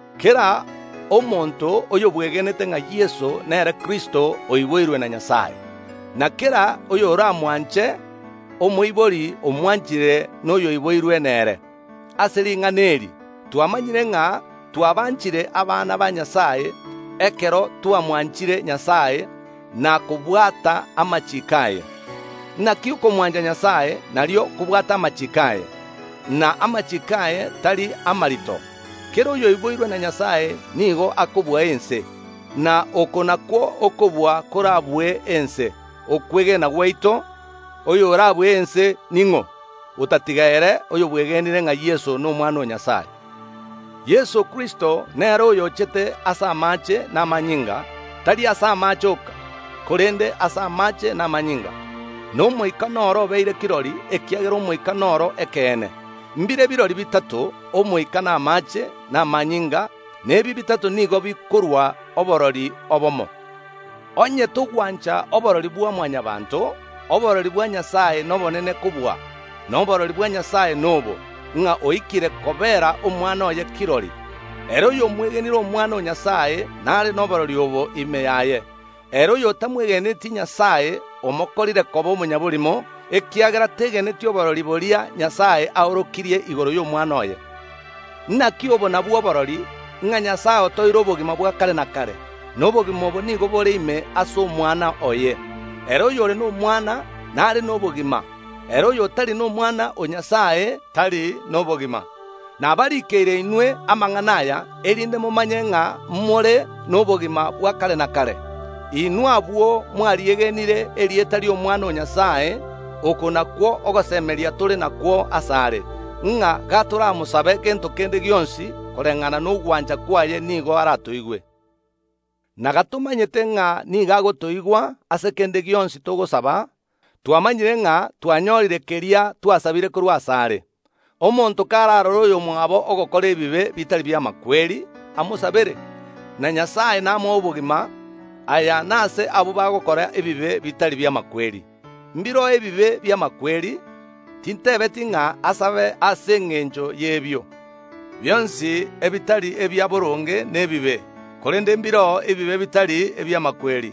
Kera omonto oyobwegenete ng’a Yeso nere Kristo oiboirwe na Nyasae, na kera oyoramwanche omoibori, omwanchire na oyoiboirwe nere. Ase ring’ana eri twamanyire ng’a twabanchire abana ba Nyasae ekero twamwanchire Nyasae, na kobwata amachiiko aye. Naki okomwancha Nyasae nario okobwata amachiiko aye, na amachiiko aye tari amarito. Kera oyoiboirwe na Nyasae nigo akobua ense, na oko nakwo okobua korabue ense, okwegena gwaito. Oyorabue ense ning’o, otatiga ere oyobwegenire ng’a Yeso n’Omwana o Nyasae? Yeso Kristo, nere oyo ochete ase amaache na amanyinga, tari ase amaache oka, korende ase amaache na amanyinga. Na Omoika noro obeire kirori, ekiagera Omoika noro ekeene. Mbire birori bitato: Omoika, na amaache, na amanyinga, na ebi bitato nigo bikorua oborori obomo. Onye togwancha oborori bwa Mwanyabaanto, oborori bwa Nyasae nobonene kobua, na oborori bwa Nyasae nobo, ng’a oikire kobeera Omwana oye kirori. Ere oyomwegenire Omwana o Nyasae nare noborori obwo ime yaye. Ere oyotamwegeneti Nyasae omokorire koba omonyaborimo, ekiagera tegeneti oborori boria Nyasae aorokirie igoro y’Omwana oye. Naki obo nabwo oborori, ng’a Nyasae otoeire obogima bwa kare na kare, na obogima obo nigo bore ime ase Omwana oye. Ere oyore n’Omwana, nare nobogima; ere oyotari n’Omwana o Nyasae, tari nobogima. Nabarikeire inwe amang’ana aya, erinde momanye ng’a more nobogima bwa kare na kare, inwe abwo mwariegenire erieta ri’Omwana o Nyasae. Oko nakwo ogosemeria tore nakwo asare, ng’a gatoramosabe gento kende gionsi koreng’ana nogwancha kwaye, nigo aratoigwe. Na gatomanyete ng’a nigo agotoigwa ase kende gionsi togosaba, twamanyire ng’a twanyorire keria twasabire korwa asare. Omonto kararore oyomwabo ogokora ebibe bitari bi’amakweri, amosabere, na Nyasae namoe obogima; aya nase abwo bagokora ebibe bitari bi’amakweri. Mbireo ebibe bi’amakweri; tintebeti ng’a asabe ase engencho y’ebio. Bionsi ebitari ebiaboronge nebibe, korende mbireo ebibe bitari ebi’amakweri.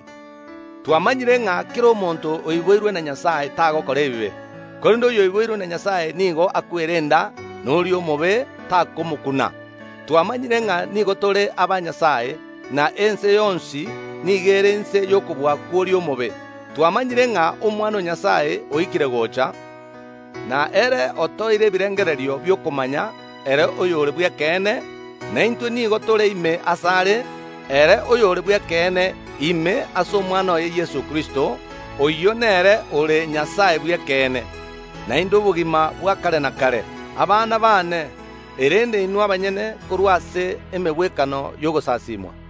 Twamanyire ng’a kera omonto oiboirwe na Nyasae tagokora ebibe, korende oyoiboirwe na Nyasae nigo akwerenda, na oria omobe takomokuna. Twamanyire ng’a nigo tore aba Nyasae, na ense yonsi nigo ere inse y’okobua kw’oria omobe. Twamanyire ng’a Omwana o Nyasae oikire gocha, na ere otoeire ebirengererio bi’okomanya ere oyore bw’ekeene. Na intwe nigo tore ime asare ere oyore bw’ekeene, ime ase Omwana oye Yeso Kristo. Oyio nere ore Nyasae bw’ekeene, naende obogima bwa kare na kare. Abana baane, erende inwe abanyene korwa ase emegwekano y’ogosasimwa.